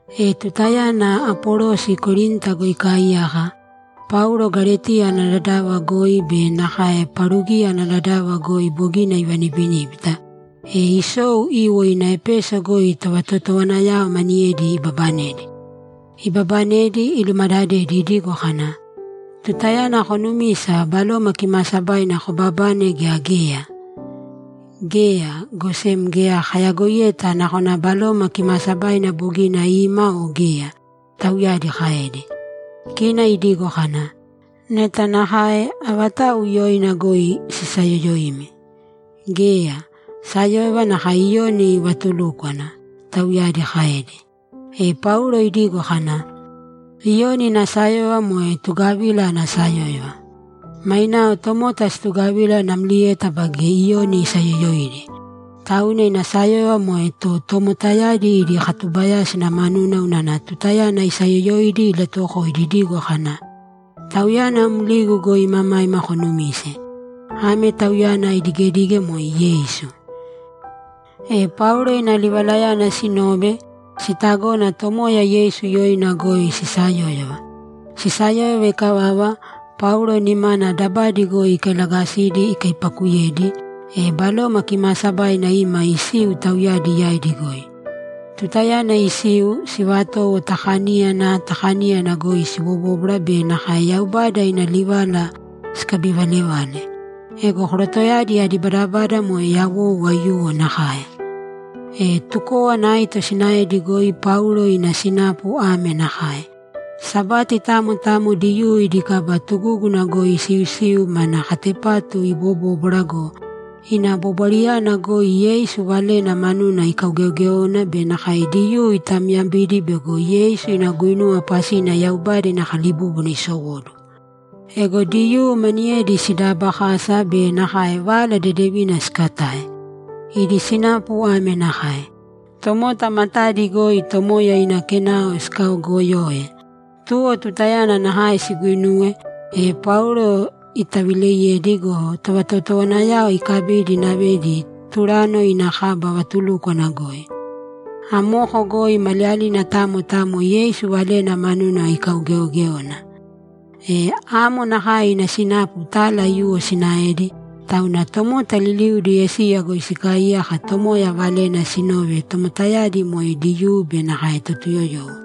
E tutayana Apolosi Korinta goi ikaaiyaka, Paulo Galetiya ana dadava goi be nakae Parugiya ana dadava goi bogina ivanibiníbita, e isou iiwo ina Epeso goi tovatotowanayao maniyedi ibabanedi. Ibabanedi, ilumadadedi idigo kana, ‘Tutayana konumisa, Baloma Kimaasabaina kobabane gea geya?’ ‘Geya, go sem geya kayagoiyeta nakona Baloma Kimaasabaina bogina ima o geya’, tauyadi kaedi. Kina idigo kana, ‘Neta nakae, avatau yoina goi sisayoyoimi?’ ‘Geya, sayóyova nakae Iyoni ivatulúkwana’, tauyadi kaedi. E Paulo idigo kana, ‘Iyoni ina sayóyova moe tugavila ana sayóyova. Mainao tomota situgavila namlieta baige Iyoni isayoyoidi. Tauna ina sayóyova moe to tomotayadi idi katubayásina manuna unana tutayana isayoyoidi ilatuwokoidi idigo kana, “Tauyana mligu goi imamaima konumīse.” Ame tauyana idigedige moe Yeisu.’ E Paulo ina livalayana sinove, sitagona Tomoya Yeisu yoina goi sisayóyova. Sisayóyova ikavava, Paulo nimana dabadi goi ikailagasidi ikaipakuyedi, e Baloma Kimaasabaina ima isiu tauyadi yaidi goi. Tutayana isiu, sivatowo ta kaníyana ta kaníyana goi sibobóbwara be nakae Yaubada ina livala sikabivalevale. Ego korotoyadi adi badabada moe yawou aiyuwo nakae. E tukówana aito sinaedi goi Paulo ina sinapu ame nakae: Sabati tamo tamo Diyuu idi kaba tugúguna goi isiusiu mana katepatu ibobóbwara go, ina bobwarayana goi Yeisu valena manuna ikaugeogéona be nakae Diyuu itamyabidi bego Yeisu ina guinuwa pasina Yaubada ina kalibúbuna isowóduwo. Ego Diyuu maniyedi sidaabakasa be nakae Vala Dedevina sikatae. Idi sinapu ame nakae: Tomota matadi goi Tomoya ina Kenao sikaogoyoe. Tuwo tutayana nakae siguuinuwe, e Paulo itavileiyedi go, tovatotowanayao ikabidi inavedi Turano ina kaba vatulúkwana goi. Amoko goi maliyalina tamo tamo Yeisu valena manuna ikaugeogéona. E amo nakae ina sinapu tala aiyuwo sinaedi, tauna tomota liliudi Esiya goi sikaaiyaka Tomoya valena sinove, tomotayadi moe Diyuu be nakae Totuyoyowo.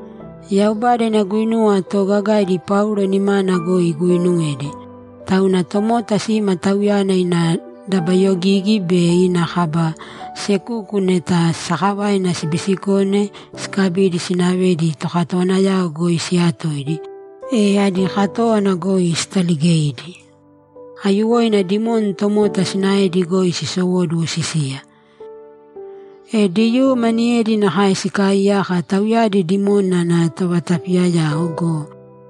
Yaubada ina guinuwa toogagaidi Paulo nimana goi iguuinuwedi, tauna tomota sima tauyana ina dabayogigi be ina kaba sekuku neta sakavaina sibiisikone sikabidi sinavedi tokatowanayao goi siyatoidi, e adi katówana goi sitaligeidi! Aiyuwoina dimoni tomota sinaedi goi sisowóduwo sisiya. E Diyuu maniyedi nakae sikaaiyaka, tauyadi dimoni ana tovatapiyayao go,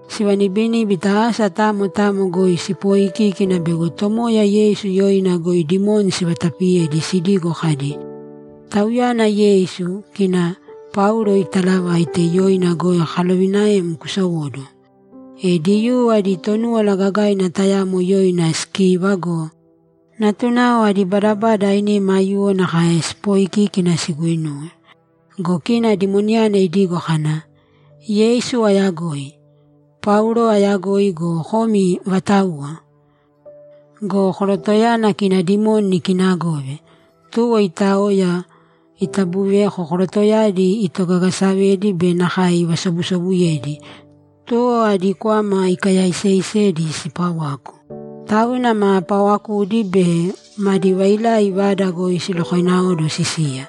sivanibiníbita asa tamo tamo goi sipooikíkina bego Tomoya Yeisu yoina goi dimoni sivatapiye sidigo kadi, ‘Tauyana Yeisu, kina Paulo itaalavaite, yoina goi kalovinaem kusowōduwo!’ E Diyuu adi Tonúwala Gagaina tayamo yoina Skiva go, natunao adi badabada ainima aiyuwo nakae sipooikiki siguinuwe. Go kina dimoniyana idigo kana, ‘Yeisu ayagoi; Paulo ayagoi go, komi vatauwa?’ Go korotoyana, kina dimoni ikiinagove, tuwo itaoya, itabuveva korotoyadi itogagasavedi be nakae ivasobusobuyedi, tuwo adi kwama ikayaiseisedi sipawaku. Tauna ma pawakudi be madi vailai vada goi silokoináoduwo sisiya.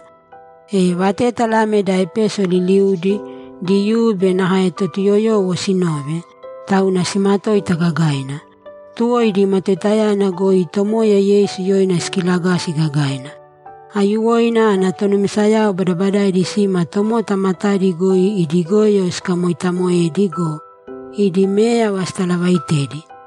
E vatétala ame da Epeso liliudi, Diyuu be nakae Totuyoyowo, sinove, tauna simatoita gagaina. Tuwo idi matoitayana goi Tomoya Yeisu yoina sikilagasi gagaina. Aiyuwoina ana tonumisayao badabadaidi sima tomota matadi goi idi goyo sikamoitamoedi go, idi méyava sitalavaitedi.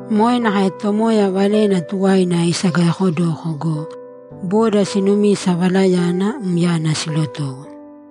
Moe nakae Tomoya valena tuwaina isagayaakodoko go, boda siinumisa valayana myana silotowo.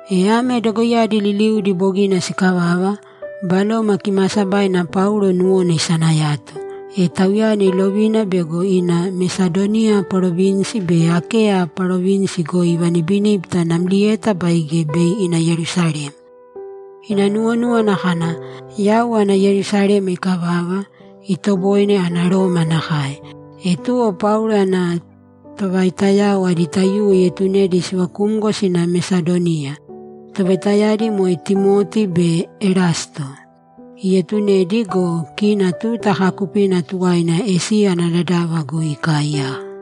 E ame dogoiyadi liliudi bogina sikavava, Baloma Kimaasabaina Paulo nuwona isanayato, e tauyana ilovina bego ina Mesadoniya parovinsi be Akeya parovinsi goi ivanibiníbita namlieta baige bei ina Yerusalema. Ina nuwonúwana kana, ‘Yau ana Yerusalema ikavava, itoboine ana Roma nakae.’ E tuwo Paulo ana tovaitayao adi taiyuwo ietunedi sivakumgo sina Mesadoniya; tovaitayadi moe Timoti be Erasto. Ietunedi go, kina tuta kaakupina tuwaina Esiya ana dadava goi ikaaiyaka.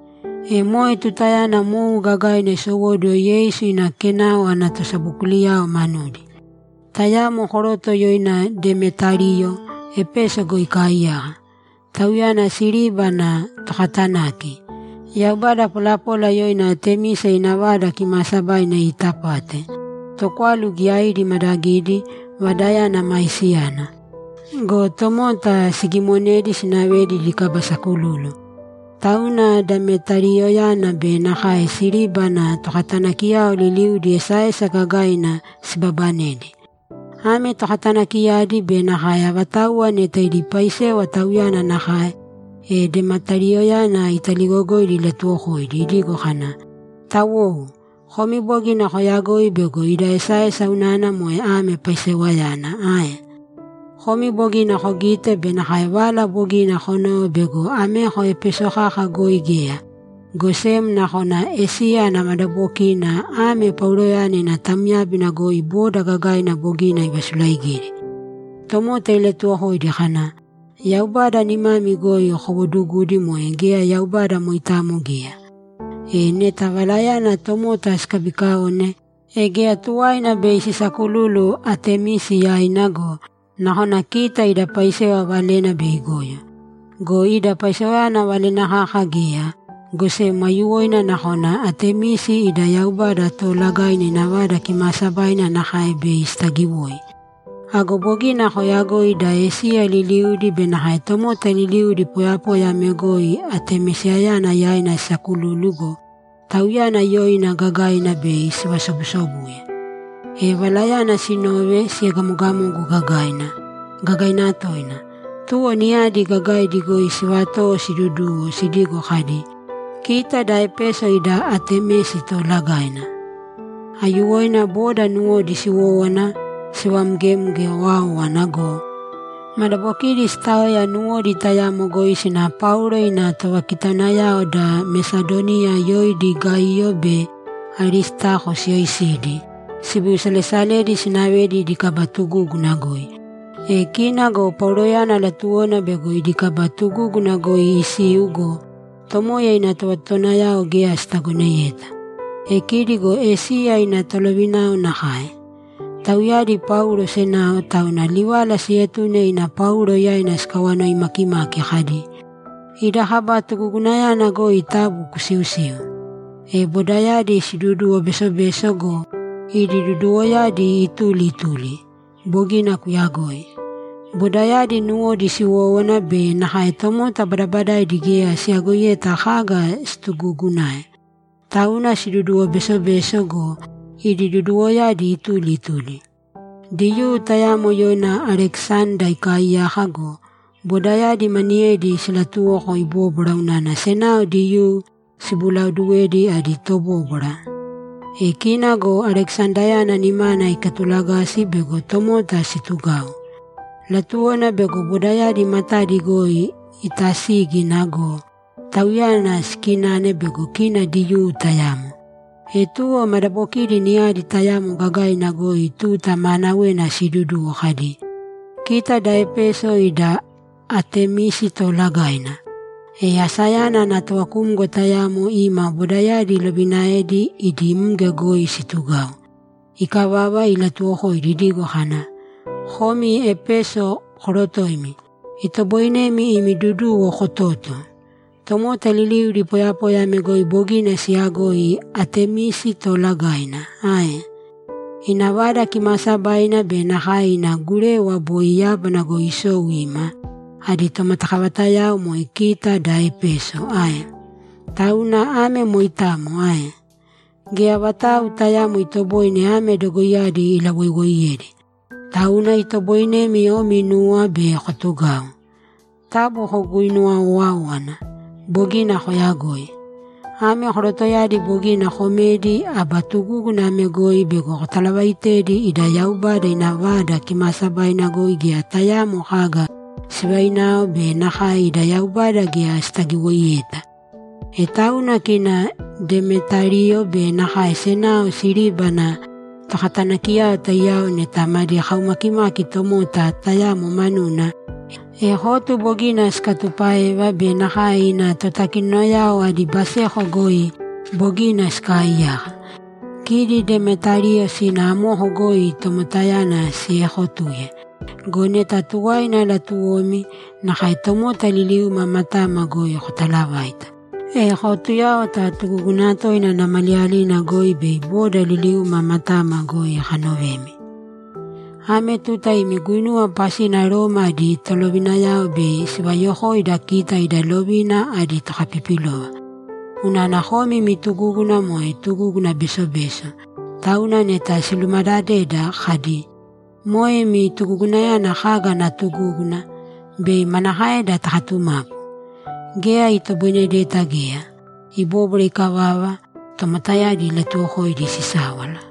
E moe tutayana mou gagaina isowóduwo Yeisu ina Kenao ana tosabokuliyao manudi. Tayamo koroto yoina Demetariyo Epeso goi ikaaiyaka. Tauyana siriba ana tokatanaki. Yaubada polapola yoina Atemisi ina vada kimaasabaina iitapate, tokwalu giyaidi imaadagidi, vadayana maisiyana. Go tomota sigimonedi sinavedi idi kaba sakululu. Tauna Demetariyoyana be nakae siriba ana tokatanakiyao liliudi esaesa gagaina sibaabanedi. Ame tokatanakiyadi be nakae avatauwa neta idi paisewa tauyana nakae, e Demetariyoyana italigogoidi ilatuwokoidi idigo kana, ‘Tawou, komi bogina koyagoi bego ida esaesa unana moe ame paisewayana ae? Komi bogina kogite be nakae vala bogina konove bego ameko Epeso kaka goi geya, go sem nakona Esiya ana madabokina ame Pauloyana ina tamyábina goi boda gagaina bogina ivasulaigidi. Tomota ilatuuwokoidi kana, “Yaubada nimami goi kowoodugudi moe geya yaubada moitamo geya.” E, neta valayana tomota sikabikaone, e geya tuwaina bei sisaakululu Atemisi yaina go, nakona kita ida paisewa valena bei igoyo. Go ida paisewayana valena kaka geya, go sem aiyuwoina nakona Atemisi ida yaubada toolagaina ina vada kimaasabaina nakae bei sitagiwoi! Ago bogina koyagoi da Esiya liliudi be nakae tomota liliudi poyapoya ame goi Atemisiyana yaina sisakululu go, tauyana yoina gagaina bei sivasobusobuye.’ E valayana sinove, siegamogamogu gagaina, gagaina toina. Tuwo niyadi gagaidi goi sivatowo siiduduwo sidigo kadi, ‘Kita da Epeso ida Atemisi toolagaina!’ Aiyuwoina boda nuwodi siwówana sivamgemge owáowana go, madabokidi sitaoya nuwodi tayamo goi sina Paulo ina tovakitaunayao da Mesadoniya yoidi Gaiyo be Aristako siyoisidi sibiusalesaledi sinavedi idi kaba tugúguna goi. E kina go Pauloyana latuwona bego idi kaba tugúguna goi isiu go, Tomoya ina tovatotowanayao geya sitagoneyeta. E kidi go Esiya ina tolovinao nakae. Tauyadi Paulo senao, tauna livala sietune ina Paulo yaina sikawanoi makimaki kadi, ‘Idi kaba tugugunayana goi taabu kusiusīu.’ E bodayadi siduduwo besobeso go, idi duduwoyadi ituli ituli. Bogina kuyagoi. Bodayadi nuwodi siwówana be nakae tomota badabadaidi geya siyagoiyeta kaga situgugunae. Tauna siduduwo besobeso go, idi duduwoyadi ituli ituli. Diyuu tayamo yoina Alekisanda ikaaiyaka go, bodayadi maniyedi silatuwoko ibóbwara unana senao Diyuu sibulaoduwe adi tobóbwara. E kina go Alekisandayana nimana ikatulagasi bego tomota situgau; latuwona bego bodayadi matadi goi itasígina go, tauyana sikinane bego kina Diyuu tayamo. E tuwo madabokidi niyadi tayamo gagaina goi tuta maanawena siiduduwo kadi, ‘Kita da Epeso ida Atemisi toolagaina!’ E asayana ana tovakumgo tayamo ima bodayadi ilovinaedi idi mge goi situgau. Ikavava, ilatuwokoidi idigo kana, ‘Komi Epeso korotoimi, itoboinemi imi duduwo kototo. Tomota liliudi poyapoya ame goi bogina siyagoi Atemisi toolagaina ae? Ina vada kimaasabaina be nakae ina gurewa, boi yábana goi isou ima, adi tomatakavatayao moe kita da Epeso ae? Tauna ame moitamo ae? Geya vatau tayaamo itoboine ame dogoiyadi ilawoiwoiyedi. Tauna itoboinemi omi inuwa be kotugau. Taabu koguinuwa owāowana. Bogina koyagoi. Ame korotoyadi bogina komedi aba tugúguna ame goi bego kotalavaitedi ida yaubada ina vada kimaasabaina goi geya tayaamo kaga sivainao be nakae ida yaubada geya sitagiwoiyeta. E tauna kina Demetariyo be nakae senao siriba ana tokatanakiyao taiyao neta madi kaumakimaki tomota tayamo manuna, e kotu bogina sikatupáeva be nakae ina totakinonayao adi baseko goi bogina sikaaiyaka. Kidi Demetariyo sīna amoko goi tomotayana siekotūye. Go neta tuwaina latuwomi, nakae tomota liliuma matama goi kotalavāita, e kootuyāwata tugúguna toina ana maliyalina goi bei boda liliuma matama goi kanovemi. Ame tuta imi guinuwa pasina Roma adi tolovinayao bei sivayokoida kita idi lovina adi tokapipilova. Unana komi imi tugúguna moe tuguguna besobeso, tauna neta silumadadeda kadi, “Moe imi tugugunayana kaga ana tugúguna?” Bei manakaeda takatumapu? Geya itoboinedeta geya.’ Ibóbwara ikavava, tomotayadi ilatuwokoidi sisáwala.